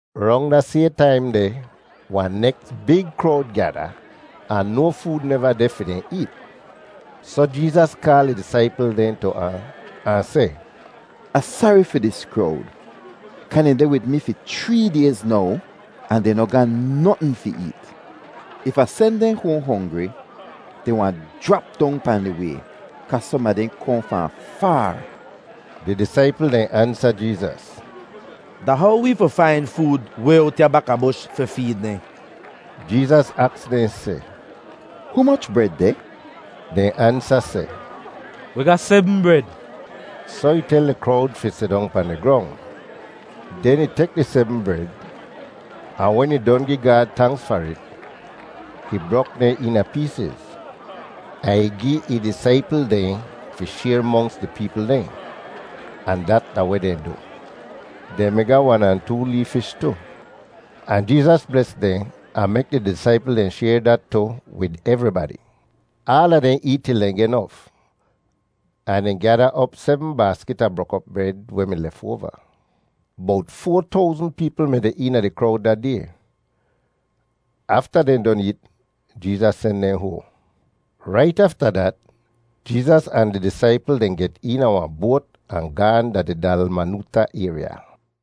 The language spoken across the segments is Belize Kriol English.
Rong da sayhn taim deh wahn neks big krowd gyada, ahn no food neva deh fi dehn eet. Soh Jeezas kaal ih disaipl dehn tu ahn, ahn seh, “Ah sari fi dis krowd kaa dehn deh wid mi fi chree dayz now ahn dehn noh ga notn fi eet. If Ah sen dehn hoahn hongri, dehn wahn jrap dong pahn di way kaa som a dehn kohn fahn faar.” Di disaipl dehn ansa Jeezas, “Da how wee fi fain food way owt ya bakabush fi feed dehn?” Jeezas aks dehn seh, “Humoch bred deh?” Dehn ansa seh, “Wi ga sebm bred.” Soh ih tel di krowd fi sidong pahn di grong. Den ih tek di sebm bred, ahn wen ih don gi Gaad tanks far it, ih brok dehn eena peesiz, ahn ih gi ih disaipl dehn fi shayr monks di peepl dehn, ahn dat da weh dehn du. Dehn mi ga wan ahn too lee fish tu, ahn Jeezas bles dehn ahn mek di disaipl dehn shayr dat tu wid evribadi. Aala dehn eet til dehn geh nof, ahn dehn gyada op sebm baaskit a brok-op bred weh mi lefoava. Bowt foa towzn peepl mi deh eena di krowd da day! Afta dehn don eet, Jeezas sen dehn hoahn. Rait afta dat Jeezas ahn di disaipl dehn get eena wahn boat ahn gaahn da di Dalmanoota ayrya.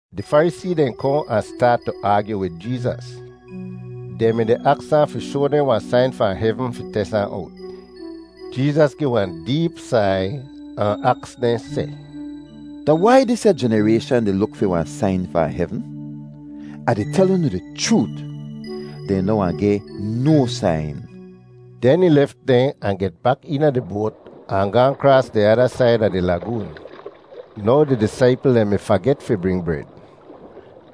Di Farisee dehn kohn ahn staat tu aagyu wid Jeezas. Dehn mi-di aks ahn fi shoa dehn wahn sain fahn hevn fi tes ahn owt. Jeezas gi wahn deep sai ahn aks dehn seh, “Da wai disya jenarayshan di luk fi wahn sain fahn hevn? Ah di tel unu di chroot, dehn noh wahn geh no sain.” Den ih lef dehn ahn get bak eena di boat ahn gaahn kraas di ada said a di lagoon. Now di disaipl dehn mi faget fi bring bred,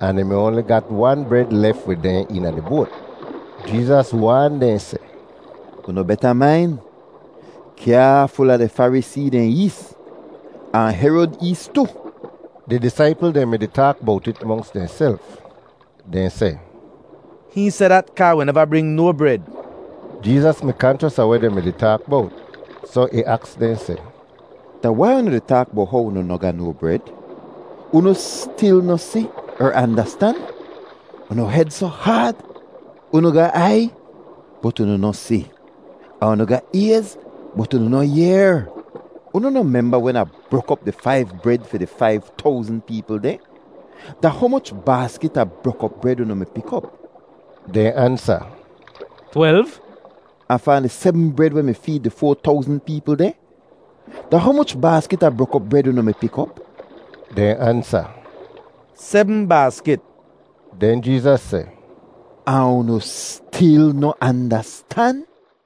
ahn dehn mi oanli ga wan bred lef wid dehn eena di boat. Jeezas waan dehn seh, “Unu beta main; kyaaful a di Farisee dehn ees ahn Herod ees tu.” Di disaipl dehn mi-di taak bowt it monks dehnself. Dehn seh, “Hihn seh dat kaa wi neva bring no bred.” Jeezas mi kanchos a weh dehn mi-di taak bowt, soh ih aks dehn seh, “Da wai unu di taak bowt how unu noh ga no bred? Unu stil noh si er andastan? Unu hed soh haad? Unu ga aiy bot unu noh si, ahn unu ga ayz bot unu noh yehr. Unu noh memba wen Ah brok op di faiv bred fi di faiv towzn peepl dehn? Da humoch baaskit a brok-op bred unu mi pik op?” Dehn ansa, “Twelv.” “Ahn fahn di sebm bred weh mi feed di foa towzn peepl dehn, da humoch baaskit a brok-op bred unu mi pik op?” Dehn ansa, “Sebm baaskit.” Den Jeezas seh, “Ahn unu stil noh andastan?”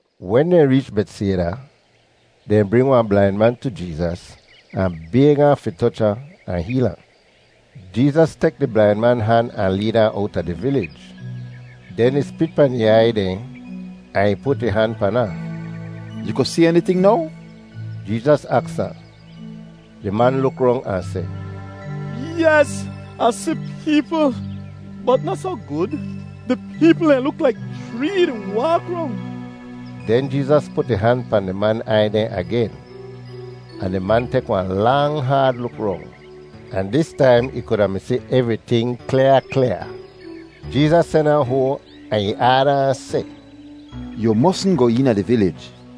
Wen dehn reech Betsayda, dehn bring wahn blain man tu Jeezas ahn bayg ahn fi toch ahn, ahn heel ahn. Jeezas tek di blain man han ahn leed ahn owta di vilij. Den ih spit pahn ih aiy dehn ahn ih put ih han pan ahn. “Yu ku si eniting now?” Jeezas aks ahn. Di man luk rong ahn seh, “Yes! Ah si peepl, bot noh soh gud. Di peepl dehn luk laik chree di waak rong!” Den Jeezas put ih han pahn di man aiy dehn agen, ahn di man tek wahn lang haad luk rong, ahn dis taim ih kuda mi si evriting klyaa klyaa. Jeezas sen ahn hoahn ahn ih aada ahn seh, “Yu mosn goh eena di vilij.”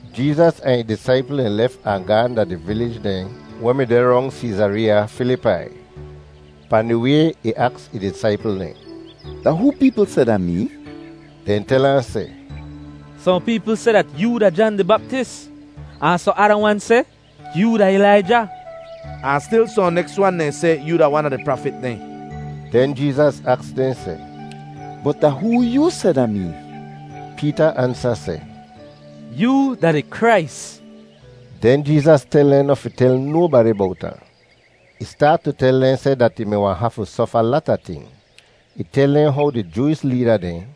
Jeezas ahn ih disaipl dehn lef ahn gaahn da di vilij dehn weh mi deh rong Seezareeya Filipai. Pahn di way ih aks ih disaipl dehn, “Da hoo peepl seh da mee?” Dehn tel ahn seh, “Sohn peepl seh dat yoo da Jan di Baptis, ahn sohn ada wan seh yoo da Ilaija, ahn stil sohn neks wan dehn seh yoo da wan a di prafit dehn.” Den Jeezas aks dehn seh, “Bot da hoo yoo seh da mee?” Peeta ansa seh, “Yoo da di Krais.” Den Jeezas tel dehn noh fi tel nobadi bowt ahn. Ih staat tu tel dehn seh dat ih mi wahn hafu sofa lata ting. Ih tel dehn how di Jooish leeda dehn,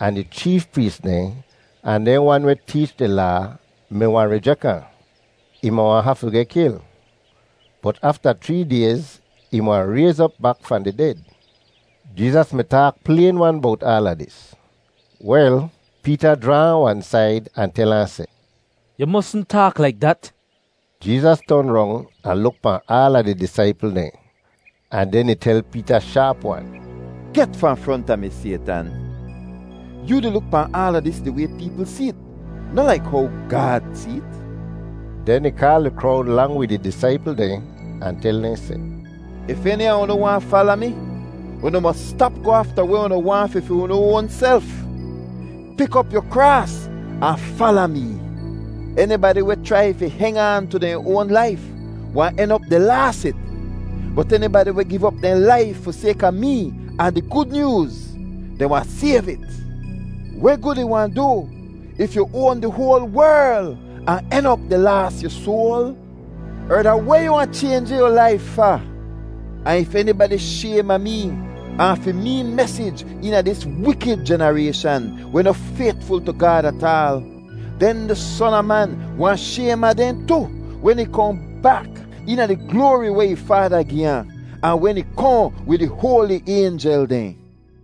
ahn di cheef prees dehn, ahn dehn wan weh teech di Laa mi wahn rijek ahn. Ih mi wahn hafu geh kil, bot afta chree dayz ih mi wahn rayz op bak fahn di ded. Jeezas mi taak playn-wan bowt aala dis. Wel, Peeta jraa ahn wan said ahn tel ahn seh, “Yu mosn taak laik dat!” Jeezas ton rong ahn luk pahn aala di disaipl dehn, ahn den ih tel Peeta shaap-wan, “Get fahn fronta mi, Saytan! Yoo di luk pahn aala dis di way peepl see't, noh laik how Gaad see't.” Den ih kaal di krowd lang wid ih disaipl dehn ahn tel dehn seh, “If eni a unu waahn fala mi, unu mos stap goh afta weh unu waahn fi fi unu oanself. Pik op yu kraas ahn fala mee. Enibadi weh chrai fi heng aan tu dehn oan laif wahn en op di laas it, bot enibadi weh giv op dehn laif fi sayka mee ahn di Gud Nyooz, dehn wahn sayv it. Weh gud ih wahn du yu if yu oan di hoal werl ahn en op di laas yu soal? Er, da weh yu wahn chaynji yu laif fa? “Ahn if enibadi shaym a mee ahn fi mee mesij eena dis wikid jenarayshan weh noh faytful tu Gaad ataal, den di Son a Man wahn shaym a dehn tu wen ih kohn bak eena di gloari weh ih Faada gi ahn, ahn wen ih kohn wid di hoali aynjel dehn.”